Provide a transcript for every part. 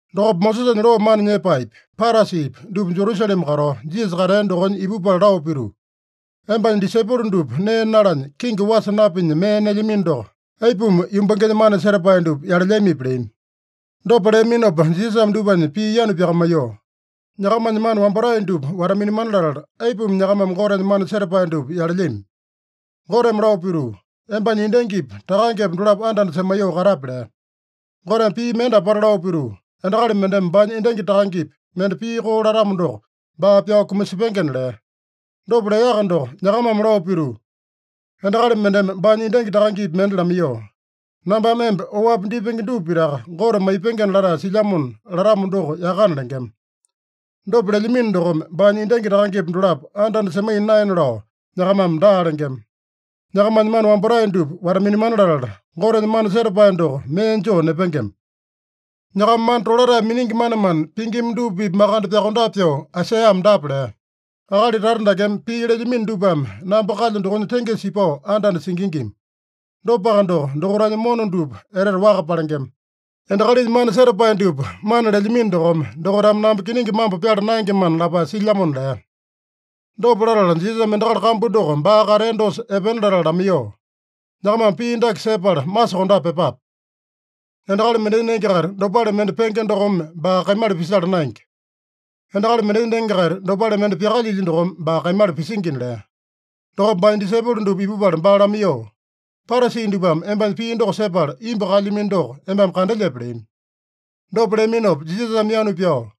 Dokopa Mosesanya loo mana nyepaepi, Parasipi dupa Jerusalema katao, Jisasa katea dokonya ipupala lao pituu, “Embanya disaipolo dupa nee nalanya, kingi wasa napinya mee nelyamino doko, aipuma yumbangenya mana setapae dupa yalelyamipi?” leami. Dopa leaminopa Jisasame dupanya pii yanu pyakamaiyoo, “Nyakamanya mana wambatae dupa wata-minamana latala, aipuma nyakamame Gotenya mana setapae dupa yalelyami? Goteme lao pituu, ‘Embanya endangipa takangepa dolapo anda-anda semaiyoo katape’ lea. Goteme pii mende apata lao pituu, ‘Endakali mendeme baanya endangi takangepi mende pii koo latamo doko, baa pyao kumasepengena’ lea. Dopa leaka doko nyakamame lao pituu: ‘Endakali mendeme baanya endangi takangepi mende lamaiyoo, “Nambame emba oapi dipenge dupa pitaka Gote maipengena latae silyamona” latamo doko yakana’ lengema. Dopa lelyamino dokome, baanya endangi takangepa dolapo anda-anda semaiya naena lao nyakamame daa lengema. Nyakamanya mana wambatae dupa wata-minamana latala, Gotenya mana setapae doko mee joo nepengema. Nyakama mana tolatae miningi manemane pingima dupa-pipa makande pyokondape pyoo Aisaiyame dapa lea: ‘Akali tata dakeme pii lelyamino dupame namba kalyo dokonya tengesa ipao anda-anda singingima. Dopaka doko, dokaitanya mona dupa etete waka palengema. Endakalinya mana setapae dupa mana lelyamino dokome, dokaitame namba kiningi mambo pyala naengemana’ lapae silyamona” lea. Dopa latala Jisasame endakali kambu doko baa katea dosa epena latala lamaiyoo, “Nyakamame pii dake sepala masokondape pyepape: Endakali mendenya nenge-kaita dopale mende penge dokome baa kaimala pisala naenge. Endakali mendenya nenge-kaita dopale mende pyakalyilya dokome baa kaimala pisingina” lea. Dokopa baanya disaipolo dupa ipupala baa lamaiyoo, “Parasi dupame embanya pii doko sepala imbu kaelyamino doko embame kandelyepe?” leami. Dopa leaminopa Jisasame yanu pyao,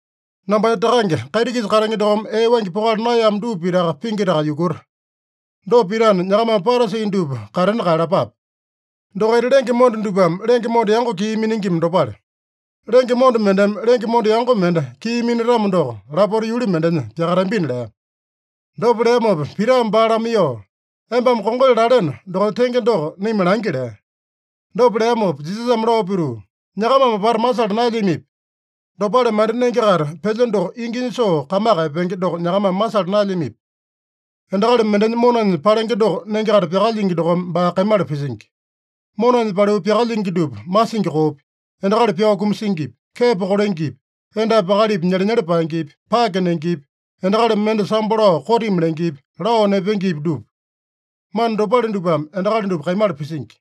“Nambanya Takange kaiti-kisa katenge dokome ee waingi pokala naeyamo dupa pitaka pingitaka yukuta. Dopa pitana, nyakamame Parasi dupa katena kaeyalapape. Dokaita lenge monda dupame lenge monda yango kii miningima dopale. Lenge monda mendeme lenge monda yango mende kii minatamo doko, lapota yuli mendenya pyakatambina” lea. Dopa leamopa Pitame baa lamaiyoo, “Embame kongali laleno dokonya tenge doko naima langi” lea. Dopa leamopa Jisasame lao pituu, “Nyakamame apata masala naelyamipi? Dopale mende nenge-kaita pelya doko inginya soo kamaka epenge doko nyakamame masala naelyamipi? Endakali mendenya monanya palenge doko nenge-kaita pyakalyingi dokome baa kaimala pisingi. Monanya paliu pyakalyingi dupa, masingi koopi, endakali pyao kumasingipi, kepo kolengepi, endapi akalipi nyelenyele paengepi, pake nengepi, endakali mende sambo lao kotimi lengepi, lao nepengepi, dupa. Mana dopale dupame endakali dupa kaimala pisingi.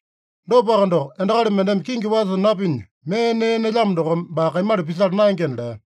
Dopaka doko, endakali mendeme kingi wasa napinya mee nee nelyamo dokome baa kaimala pisala naengena” lea.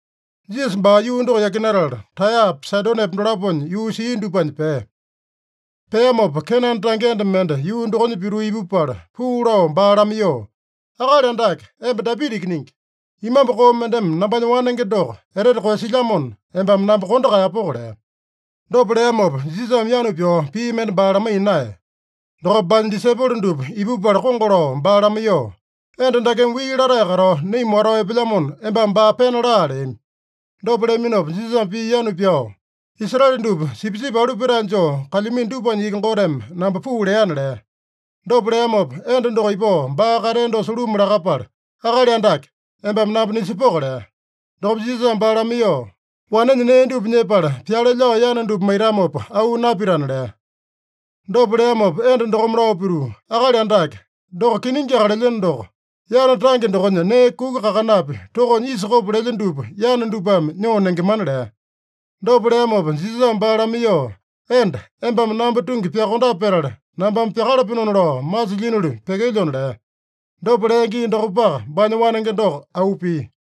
Jisasa baa yuu doko yakinatala, Taeyapa, Saidonepa dolaponya yuu sia dupanya pea. Peamopa, Kenane tange enda mende yuu dokonya pituu ipupala, puu lao baa lamaiyoo, “Akali Andake, emba Dapita Ikiningi. Imambu koo mendeme nambanya wanenge doko etete koeyasilyamona, embame namba kondo kaeyapoko” lea. Dopa leamopa Jisasame yanu pyao pii mende baa lamaiya naeya. Dokopa baanya disaipolo dupa ipupala kongo lao baa lamaiyoo, “Enda dakeme wii latae katao naima watao epelyamona, embame baa pena laa” leami. Dopa leaminopa Jisasame pii yanu pyao, “Israele dupa sipisipi alu petae joo kalyamino dupanya iki Goteme namba puu leana” lea. Dopa leamopa, enda doko ipao baa katea dosa luma lakapala, “Akali Andake, embame namba nisepoko” lea. Dokopa Jisasame baa lamaiyoo, “Wanenya nee dupa nyepala, pyale lao yana dupa maitamopa auu napitana” lea. Dopa leamopa enda dokome lao pituu, “Akali Andake, doko kiningiaka lelyeno doko, yana tange dokonya nee kuku kakanapi tokonya isa kopo lelya dupa yana dupame nyoo nengemana” lea. Dopa leamopa Jisasame baa lamaiyoo, “Enda, embame namba tungi pyakondape petala, nambame pyakalapenona lao masilyinoli pyekelyona” lea. Dopa lea gii dokopaka, baanya wanenge doko auu pia.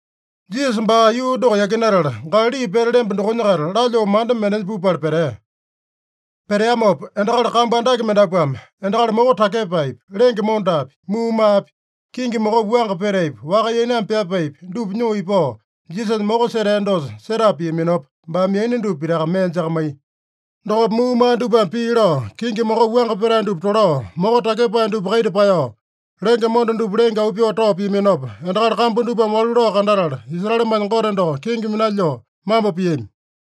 Jisasa baa yuu doko yakinatala, Galali pete lemba dokonya-kaita lalyoo manda mendenya pupala petea. Peteamopa endakali kambu andake mendapuame endakali moko takyepaepi, lenge mondapi, muumaapi, kingi mokopi wuanga petaepi, waka yainame pyapaepi dupa nyoo ipao, Jisasanya moko setea dosa setapa piaminopa, baame yaina dupa pitaka mee jakamaiya. Dokopa muumaa dupame pii lao, kingi mokopi wuanga petae dupa tolao, moko takyepae dupa kaita paeyao, lenge monda dupa lenge auu pyoo tao piaminopa, endakali kambu dupame walu lao kandatala, Israelemanya Gote doko kenge minalyoo mambo piami.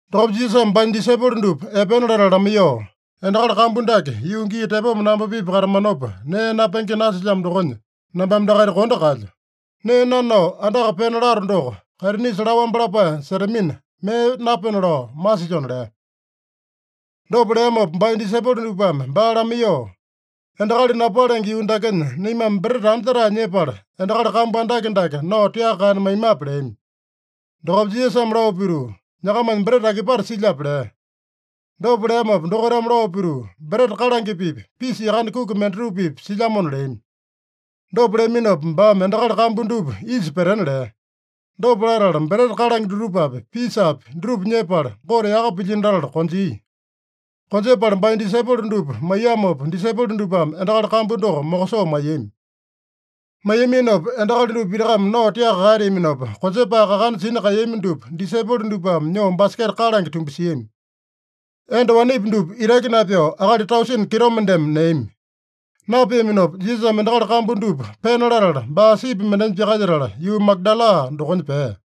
Dokopa Jisasame baanya disaipolo dupa epena latala lamaiyoo, “Endakali kambu dake yuu gii tepoma namba-pipa katamanopa, nee napenge nasilyamo dokonya, nambame dakaita kondo kaelyo. Nee nanao andaka pena lato doko, kaitinisa laowambe lapae setamina, mee napena lao masilyona” lea. Dopa leamopa baanya disaipolo dupame baa lamaiyoo, “Endakali napalenge yuu dakenya naimame breta anja-tae nyepala, endakali kambu andake dake nao tiaka kaena maimape?” leami. Dokopa Jisasame lao pituu, “Nyakamanya breta akipate silyape?” lea. Dopa leamopa dokaitame lao pituu, “Breta kalange-pipa, pisa yakane kuki mendatupa-pipa silyamona” leami. Dopa leaminopa, baame endakali kambu dupa isa petena lea. Dopa latala, breta kalange dutupapi, pisapi dutupa nyepala, Gote yaka pilyino latala konjia. Konjepala baanya disaipolo dupa maiyamopa, disaipolo dupame endakali kambu doko mokosoo maiyami. Maiyaminopa, endakali dupa pitakame nao tiaka kaeteaminopa, konjepae kakana sina kaeyami dupa disaipolo dupame nyoo baseketa kalange tumbasiami. Enda wanepi dupa itaki napyao, akali tausene kitomendeme neami. Napeaminopa Jisasame endakali kambu dupa pena latala, baa sipi mendenya pyakalyetala, yuu Magadala dokonya pea.